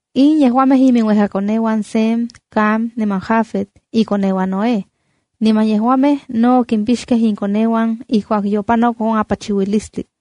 In yejuamej iminuejkakoneuan Sem, Cam niman Jafet ikoneuan Noé. Niman yejuamej no okimpixkej inkoneuan ijkuak yopanok on apachiuilistli.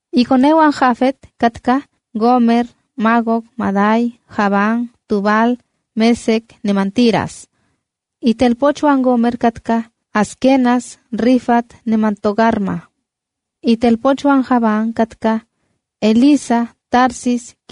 Ikoneuan Jafet katkaj: Gómer, Magog, Madai, Javán, Tubal, Mesec niman Tiras. Itelpochuan Gómer katkaj: Askenaz, Rifat niman Togarma. Itelpochuan Javán katkaj: Elisa, Tarsis,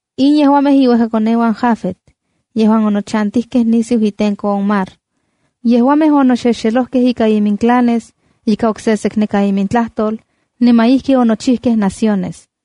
In yejuamej iuejkakoneuan Jafet yejuan onochantijkej nisiu itenko on mar. Yejuamej onoxexelojkej ika iminclanes, ika oksekneka imintlajtol niman ijki onochijkej naciones.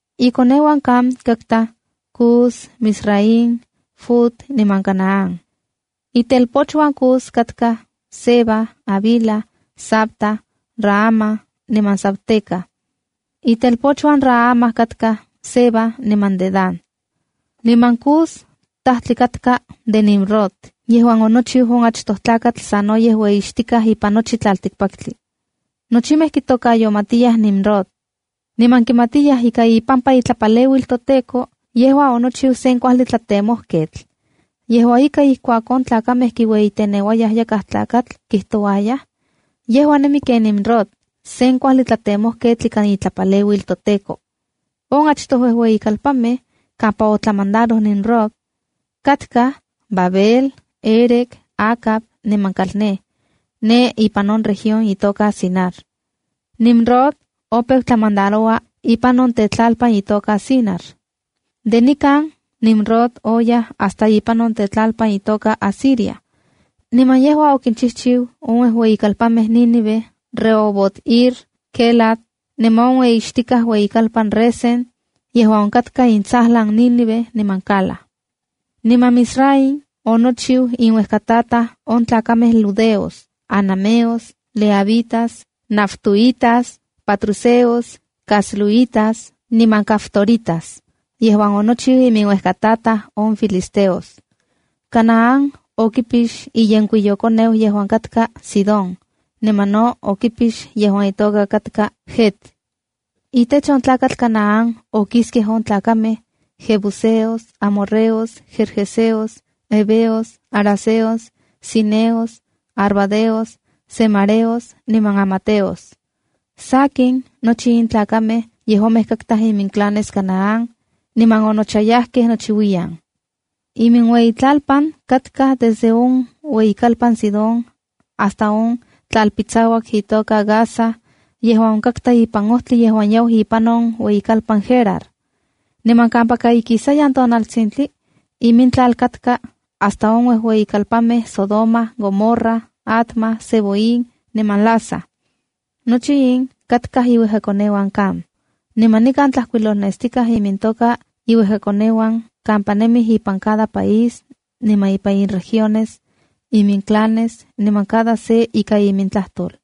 Ikoneuan Cam katkaj: Cus, Mizraimb, Fut niman Canaán. Itelpochuan Cus katkaj: Seba, Havila, Sabta, Raama niman Sabteca. Itelpochuan Raama katkaj: Seba niman Dedán. Niman Cus tajtli katka de Nimrod yejuan onochiu on achtoj tlakatl sanoyej ueyixtikaj ipan nochi tlaltikpaktli. Nochimej kitokayomatiyaj Nimrod, niman kimatiyaj ika ipampa itlapaleuil toTEKO, yejua onochiu sen kuajli tlatemojketl. Yejua ika, ijkuak on tlakamej kiueyiteneuayaj yakaj tlakatl, kijtouayaj: “Yejua nemi ken Nimrod, sen kuajli tlatemojketl ikan itlapaleuil toTEKO.” On achtoj uejueyikalpanmej kampa otlamandaroj Nimrod, katkaj: Babel, Érec, Acad niman Calné ne ipan on región itoka Sinar. Nimrod opeu tlamandaro ipan on tetlalpan itoka Sinar. De nikan Nimrod oyaj hasta ipan on tetlalpan itoka Asiria. Niman yejua okinchijchiu on ueyikalpanmej Nínive, Rehobot-ir, Quélah, niman on ueyixtikaj ueyikalpan Resén yejuan onkatka intsajlan Nínive niman Cala. Niman Mizraim onochiu inuejkataj on tlakamej ludeos, anameos, lehabitas, naftuhitas, patruseos, casluhítas niman caftoritas yejuan onochiu iminuejkataj on filisteos. Canaán okipix iyenkuiyokoneu yejuan katka Sidón niman no okipix yejuan itoka katka Het. Itech on tlakatl Canaán okiskej on tlakamej: jebuseos, amorreos, gergeseos, heveos, haraceos, sineos, arvadeos, zemareos niman hamateos. Sakin, nochi in tlakamej yejuamej katkaj iminclanes Canaán, niman onochayajkej nochiuiyan. Iminueyitlalpan katka desde on ueyikalpan Sidón hasta on tlalpitsauak itoka Gaza yejuan onkatka ipan ojtli yejuan yau ipan on ueyikalpan Gerar. Niman kampaka ikisayan tonaltsintli imintlal katka hasta on uejueyimej kalpanmej Sodoma, Gomorra, Adma, Zeboim niman Lasa. Nochi in katkaj iuejkakoneuan Cam. Niman nikan tlajkuilolnestikaj imintoka iuejkakoneuan, kampa nemij ipan cada país niman ipan iregiones, iminclanes, niman cada se ika imintlajtol.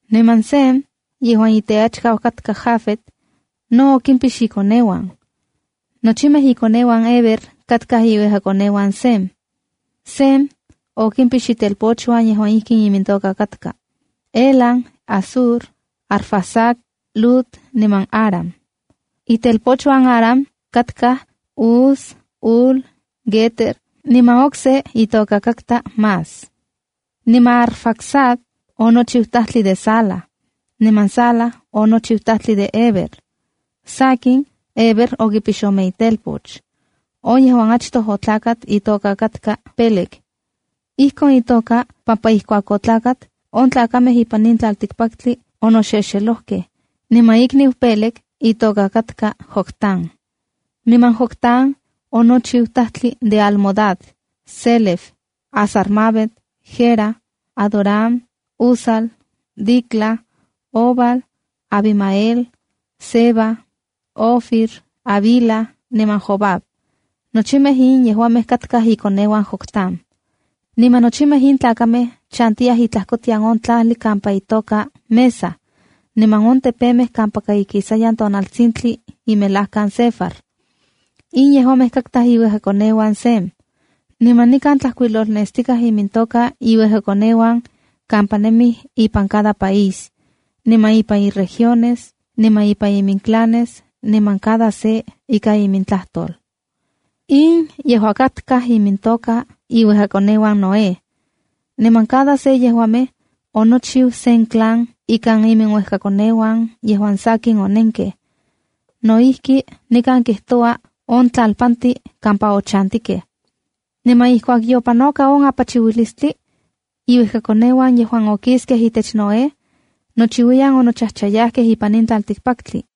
Niman Sem, yejuan iteachkau katka Jafet, no oquimpix ikoneuan. Nochimej ikoneuan Heber katkaj iuejkakoneuan Sem. Sem okimpix itelpochuan yejuan ijkin imintoka katka: Elam, Asur, Arfaxad, Lud niman Aram. Itelpochuan Aram katkaj: Us, Hul, Guéter niman okse itoka Mas. Niman Arfaxad onochiu tajtli de Sala, niman Sala onochiu tajtli de Heber. Sakin, Heber okipix ome itelpoch. On yejuan achtoj otlakat itoka katka Pélegc Ijkon itoka pampa ijkuak otlakat, on tlakamej ipan in tlaltikpaktli onoxelojkej. Niman ikniu Péleg itoka katka Joctán. Niman Joctán onochiu tajtli de Almodad, Sélef, Hazar-mavet, Jera, Adoram, Uzal, Dicla, Obal, Abimael, Seba, Ofir, Havila niman Jobab. Nochimej in yejuamej katkaj ikoneuan Joctán. Niman nochimej in tlakamej chantiyaj itlajkotian on tlajli kampa itoka Mesa niman on tepemej kampaka ikisayan tonaltsintli imelajkan Sefar. In yejuamej katkaj iuejkakoneuan Sem. Niman nikan tlajkuilolnestikaj imintoka iuejkakoneuan kampa nemij ipan cada país, niman ipan iregiones, niman ipan iminclanes, niman cada se ika imintlajtol. In yejua katkaj imintoka iuejkakoneuan Noé. Niman cada se yejuamej onochiu sen clan ikan iminuejkakoneuan yejuan sakin onenkej. No ijki, nikan kijtoua on tlalpantin kampa ochantikej. Niman ijkuak yopanoka on apachiuilistli, iuejkakoneuan yejuan okiskej itech Noé nochiuiyan onochajchayajkej ipan in tlaltikpaktli.